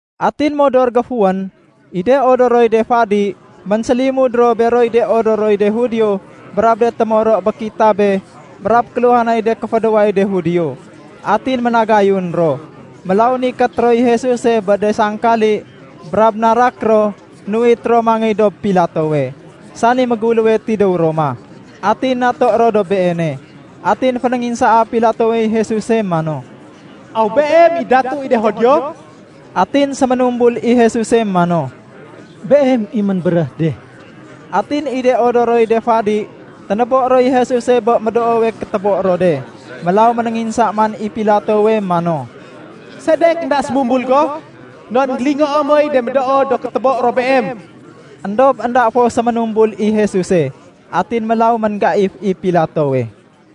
Atin modor géfuwén, i de odoroy de fadi ménsélimud ro beroy de odoroy de Judio brab de témoro bé kitabe brab kéluhanay de kéfédéway de Judio. Atin ménagayun ro. Mélaw nikét roy Jesuse bé de sangkali brab narak ro nuwit ro mangéy dob Pilatowe, sani méguléwe tidéw Roma, atin naté ro dob beene. Atin fénénginsaa Pilatowey Jesuse mano, “Aw Beem i Datu i de Judio?” Atin séménumbul i Jesuse mano, “Beem i ménbéréh de.” Atin i de odoroy de fadi ténébo roy Jesuse bé médoowe kétébo ro de. Mélaw ménénginsa man i Pilatowe mano, “Sedek énda sémumbul go? Non énggélingoo moy de médoo do kétébo ro Beem.” Endob énda fo séménumbul i Jesuse. Atin mélaw ménggaif i Pilatowe.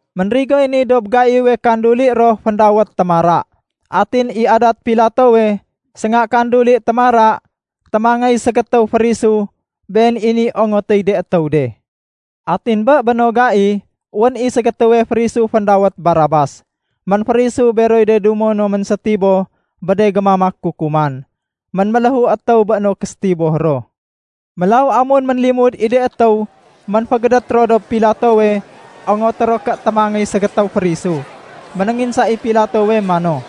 Ménrigoy ni dob gaiwe kanduli ro féndawét Témara. Atin i adat Pilatowe, sénga kanduli Témara, témangéy ségétéw férisu, been i niy ongotéy de étéw de. Atin bé béno gai, wén i ségétéwe férisu féndawét Barabas. Ménférisu beroy de dumo no ménsétiboh bé de gémamak kukuman. Ménméléhu étéw bé no késétiboh ro. Mélaw amun ménlimud i de étéw ménfégédét ro dob Pilatowe ongoté ro ké témangéy ségétéw férisu, ménénginsa i Pilatowe mano,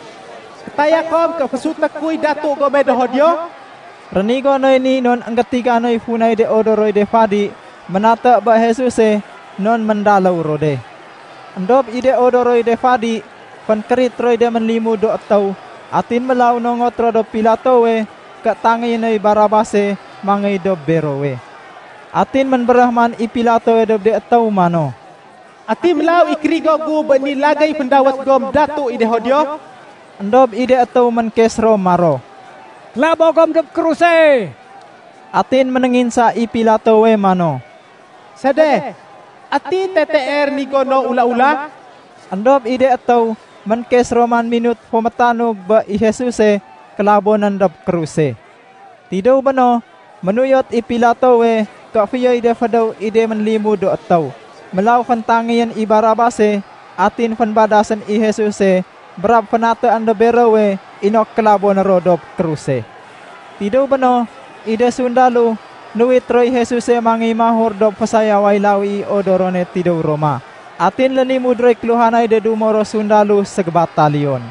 “Kétaya kom ké fésuté kuy datu gome do Judio?” Rénigo noy ni non énggétiga noy funay de odoroy de fadi ménaté bé Jesuse non méndaléw ro de. Endob i de odoroy de fadi fénkérit roy de ménlimud do étéw atin mélaw nongot ro dob Pilatowe ké tangéyé noy Barabase mangéy dob berowe. Atin ménbéréh man i Pilatowe dob de étéw mano, “Ati mélaw i kérigo gu bé ni lagéy féndawét gom ‘Datu i de Judio’?” Endob i de étéw ménkes ro maro, “Kélabo gom dob kruse!” Atin ménénginsa i Pilatowe mano, “Sede? Ati tetee rénigo no ula-ula?” Endob i de étéw ménkes ro man minut fo métanug bé i Jesuse kélabonén dob kruse. Tidéw béno, ménuyot i Pilatowe ké fiyoy de fédéw i de ménlimud do étéw. Mélaw féntangéyén i Barabase, atin fénbadasén i Jesuse brab fénatéén dob berowe inok kélaboné ro dob kruse. Tidéw béno, i de sundalo nuwit roy Jesuse mangéy mahur dob fésayaway lawi i odorone tidéw Roma. Atin lénimud roy kéluhanay de dumo ro sundalo ségébataliyon.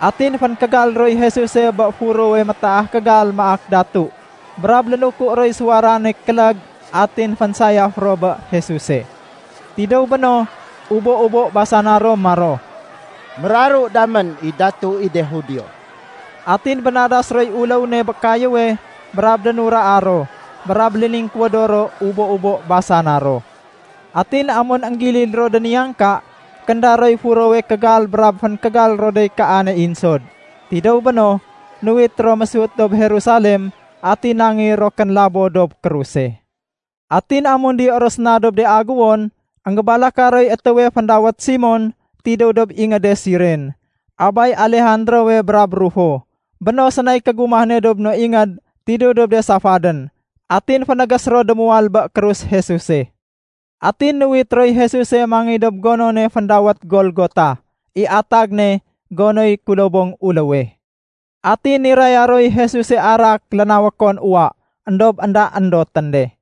Atin fénkégal roy Jesuse bé furowe métaah kégal maak datu, brab lénuku roy suwarane kélég atin fénsayaf ro bé Jesuse. Tidéw béno, ubo-ubo basana ro maro, “Méraru damén i Datu i de Judio!” Atin bénadas roy uléw ne bé kayéwe brab dénuraa ro, brab léningkuwédo ro ubo-ubo basana ro. Atin amun énggilid ro déniyangka, kénda roy furowe kégal brab fénkégal ro dey kaane insod. Tidéw béno, nuwit ro mésut dob Jerusalem atin nangéy ro kénlabo dob kruse. Atin amun diyo ro séna dob de aguwon, énggébalaka roy étéwe féndawét Simon tidéw dob ingéde Siren, abay Alejandrowe brab Rufo. Béno sénay kégumah ne dob no ingéd tidéw dob de safadén. Atin fénégés ro démuwal bé krus Jesuse. Atin nuwit roy Jesuse mangéy dob gonone féndawét Golgota (i atag ne “gonoy kulobong uléwe”). Atin niraya roy Jesuse arak lénawékon uwa, éndob énda éndotén de.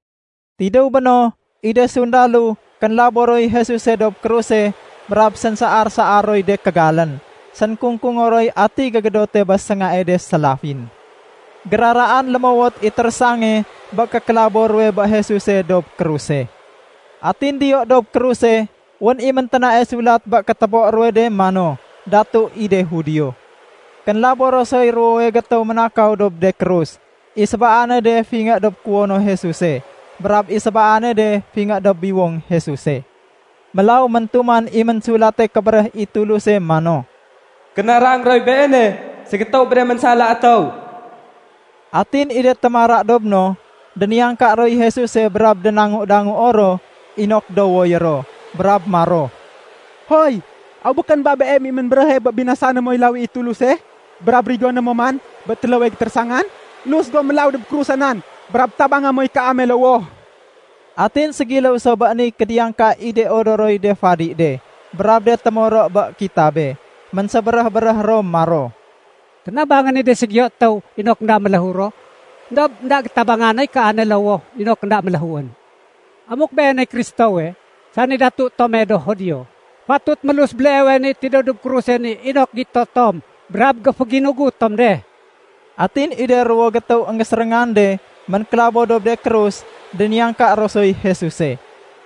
Tidéw béno, i de sundalo kénlabo roy Jesuse dob kruse brab sénsaar-saar roy de kégalén, sénkungkungo roy ati gégédote bé séngae de sélafin. Géraraan lémowot i térésange bé kékélabo ruwe bé Jesuse dob kruse. Atin diyo dob kruse wén i ménténae sulat bé kétébo ruwe de mano, “Datu i de Judio”. Kénlabo ro soy ruwowe gétéw ménakaw dob de krus. I sébaane de fingé dob kuwono Jesuse, brab i sébaane de fingé dob biwong Jesuse. Mélaw méntuman i Ménsulate Kébéréh i Tuluse mano, “Kénarang roy Beene ségétéw bé de ménsala étéw.” Atin i de témara dob no, déniyangka roy Jesuse brab dangu-danguo ro inok duwoyé ro, brab maro, “Hoy! Aw békén ba Beem i ménbéréhe bé binasané moy lawi i Tuluse brab rigoné mo man bé téléwe gétérésangan? Lus go mélaw dob krusa nan brab tabanga moy kaame lowoh.” Atin ségiléw so bé niy kédiyangka i de odoroy de fadi de brab de témoro bé kitabe. Ménsébéréh-béréh ro maro, “Ténabangén i de ségiyo étéw inok énda méléhu ro, éndob énda gétabanga noy kaane lowoh inok énda méléhuén. Amuk Beeney Kristowe, sani datu tome do Judio, fatut mélus béleewe ni tidéw dob kruse ni inok gito tom brab géféginugut tom de.” Atin i de ruwo gétéw énggéséréngan de ménklabo dob de krus, déniyangka ro soy Jesuse.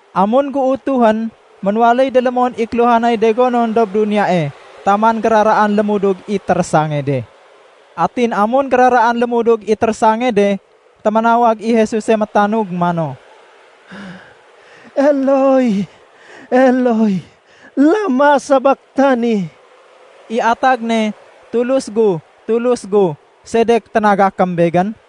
Amun géutuhén, ménwaléy délémon i kéluhanay de gonon dob duniyae taman géraraan lémudug i térésange de. Atin amun géraraan lémudug i térésange de, téménawag i Jesuse métanug mano, “Eloi, Eloi, lama sabaktani?” I atag ne “Tulus gu, Tulus gu, sedek ténagakém Begén?”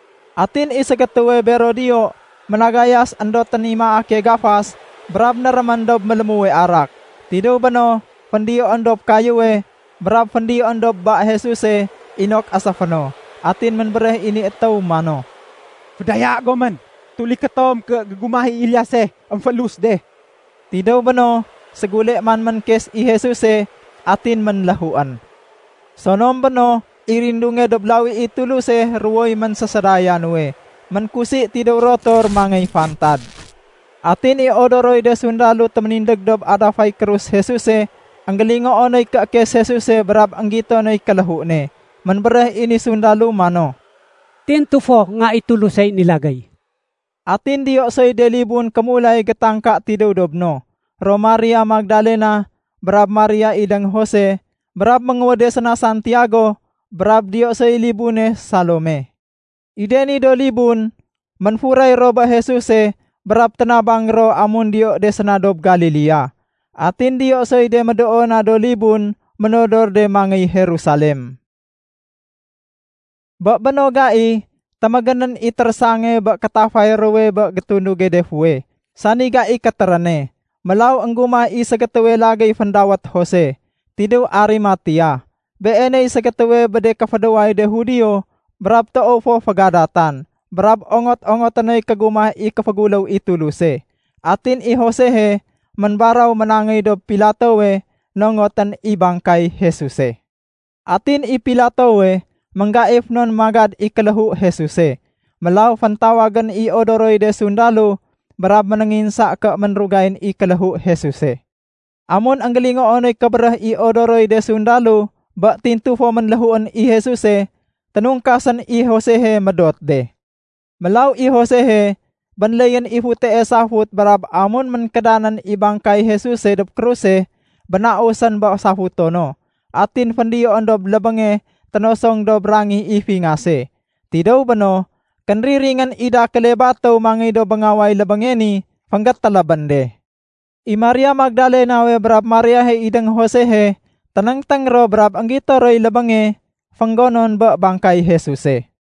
Atin i ségétéwe bero diyo, ménagayas éndotén i maake gafas brab nérémén dob mélémuwe arak. Tidéw béno, féndiyoén dob kayéwe brab féndiyoén dob ba Jesuse inok éséfé no. Atin ménbéréh i ni étéw mano, “Fédaya gomén. Tuliké tom ké gégumah i Eliase émfélus de.” Tidéw béno, ségule man ménkes i Jesuse, atin ménléhuén. Sonom béno, i rindunge dob lawi i Tuluse ruwoy ménsésédaya nuwe, ménkusi tidéw rotor mangéy fantad. Atin i odoroy de sundalo téménindég dob adafay krus Jesuse, énggélingoo noy kéékes Jesuse brab énggito noy kéléhu ne. Ménbéréh i ni sundalo mano, “Tintu fo Nga i Tulusey ni lagéy.” Atin diyo soy de libun kémulay gétangka tidéw dob no, ro Maria Magdalena, brab Maria idéng Jose brab ménguwéde séna Santiago, brab diyo soy libune Salome. I de ni do libun, ménfuray ro bé Jesuse brab ténabang ro amun diyo de séna dob Galilea. Atin diyo soy de médoo na do libun ménodor de mangéy Jerusalem. Bé béno gai, témégénén i térésange bé kétafay ruwe bé gétunduge de fuweh, sani gai kétéréne. Mélaw énggumah i ségétéwe lagéy féndawét Jose, tidéw Arimatea. Beeney ségétéwe bé de kéfédéway de Judio, brab toow fo fégadatan. Brab ongot-ongoté noy kégumah i kéféguléw i Tuluse. Atin i Josehe ménbaraw ménangéy dob Pilatowe nongotén i bangkay Jesuse. Atin i Pilatowe, ménggaif non magad i kéléhu Jesuse. Mélaw féntawagén i odoroy de sundalo brab ménénginsa ké ménrugayén i kéléhu Jesuse. Amun énggélingoo noy kébéréh i odoroy de sundalo bé tintu fo ménléhuén i Jesuse, ténungkasén i Josehe médot de. Mélaw i Josehe, bénléyén i futee safut brab amun ménkédanén i bangkay Jesuse dob kruse, bénausén bé safuto no. Atin féndiyoén dob lébénge ténosong dob rangih i fingase. Tidéw béno, kénriringén i dakéle batéw mangéy dob béngaway lébénge ni fénggétélébén de. I Maria Magdalenawe brab Mariahe idéng Josehe ténéngténg ro brab énggito roy lébénge fénggonon bé bangkay Jesuse.